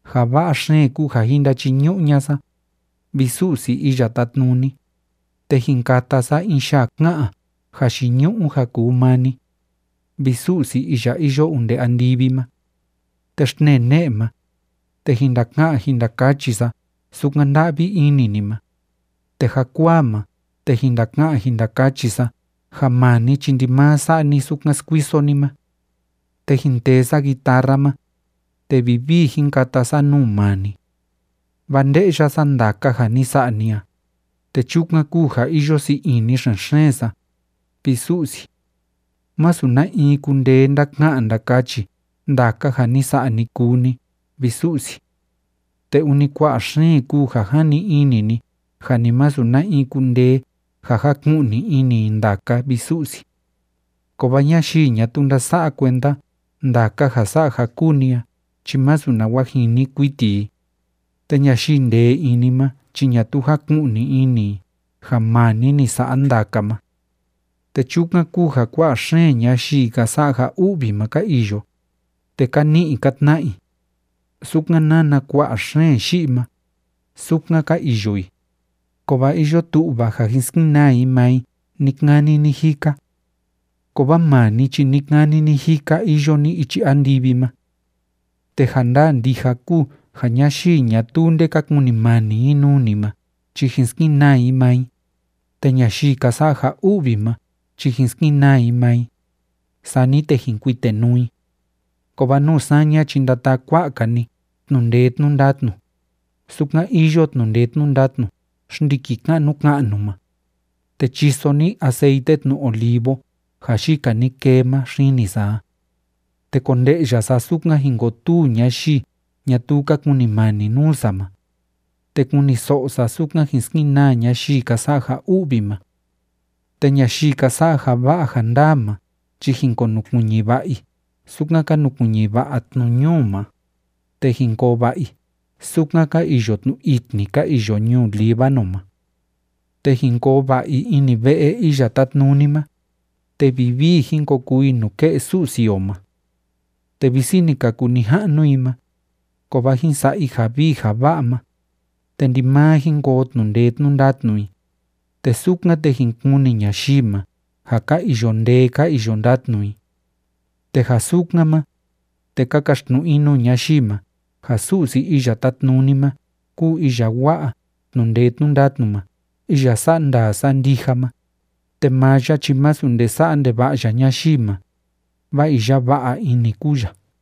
Ja va'a xeen kúu ja jin ndachiñu'u ña'a sa, vi Su'si Iya Tátnuni, te jin kata sa in yaa ká'an jayiñu'u ja kuu maa ni, vi Su'si iya iyo onde andivi ma. Te xtnee ne'e ma, te jin ndaka'an jin ndakachi sa sukan nda'vi ini ni ma, te jakuaa ma, te jin ndaka'an jin ndakachi sa ja maa ni chi ndimaa sa'a ni sukan skuiso ni ma. Te jin tee sa guitarra ma, te vivii jin kata sa nuu maa ni. Vaa nde'ya sa ndaka ja ni sa'a ni a, te chukan kúu ja iyo sii ini xen‑xeen sa, vi Su'si. Masu na in kundee ndaka'an ndakachi ndaka ja ni sa'a, ni kuu ni, vi Su'si. Te ûni kua'a xeen kúu ja jani ini ni ja ni masu na in kundee ja jaku'ni ini i ndaka, vi Su'si. Kovaa ñayii ñatuu ndása'a kuenda ndaka ja sa'a ja kúu ni a chi masu nawa jini kuiti i, te ñayii ndee ini ma chi ñatuu jáku'ni ini i ja maa ni ni sa'a ndaka ma. Te chukan kúu ja kua'a xeen ñayii ka sa'a ja u'vi ma ka iyo, te ka ni'i ka tna'a i. Sukan nána kua'a xeen yi'i ma, sukan ka iyo i, kovaa iyo tu'va ja jin skenaa i maa i ni‑kani ni‑jika. Kovaa maa ni chi ni‑kani ni‑jika iyo ni ichi andivi ma. Te ja ndaa ndija kúu ja ñayii ñatuu nde ka kunimani i nuu ni ma chi jin skenaa i maa i, te ñayii ka sa'a ja u'vi ma chi jin skenaa i maa i, sani te jin kuitenuu i. Kovaa nuu saña chi ndataa kua'a‑ka ni tnu'u ndee tnu'u ndatnu, sukan iyo tnu'u ndee tnu'u ndatnu xndiki ka'nu ka'nu ma, te chiso ni aceite tnu olivo ja yika ni kee ma xini sa a. Te konde'ya sa sukan jin kotuu ñayii ñatuu ka kunimani nuu sa ma, te kuniso'o sa sukan jin skenaa ñayii ka sa'a ja u'vi ma. Te ñayii ka sa'a ja va'a ja ndaa ma chi jin konukuiñi va'a i sukan ka nukuiñi va'a tnu ñuu ma, te jin koo va'a i sukan ka iyo tnu itni ka iyo ñuu Líbano ma. Te jin koo va'a i ini ve'e Iya Tátnuni ma, te vivii jin ko kuu i nuke'e Su'si o ma. Te visi ni ka kuu nija'nu i ma, kovaa jin sa'a i ja vii ja va'a ma, te ndimaa jin koo tnu'u ndee tnu'u ndatnu i, te sukan, te jin kuni ñayii ma ja ka iyo ndee ka iyo ndatnu i. Te ja sukan ma, te ka kaxtnu'u i nuu ñayii ma ja Su'si Iya Tátnuni ma kúu iya wa'a tnu'u ndee tnu'u ndatnu ma iya sa'a ndaa sa'a ndija ma, te maa ya chi masu nde sa'a ndeva'a ya ñayii ma, vaa iya va'a ini kúu ya.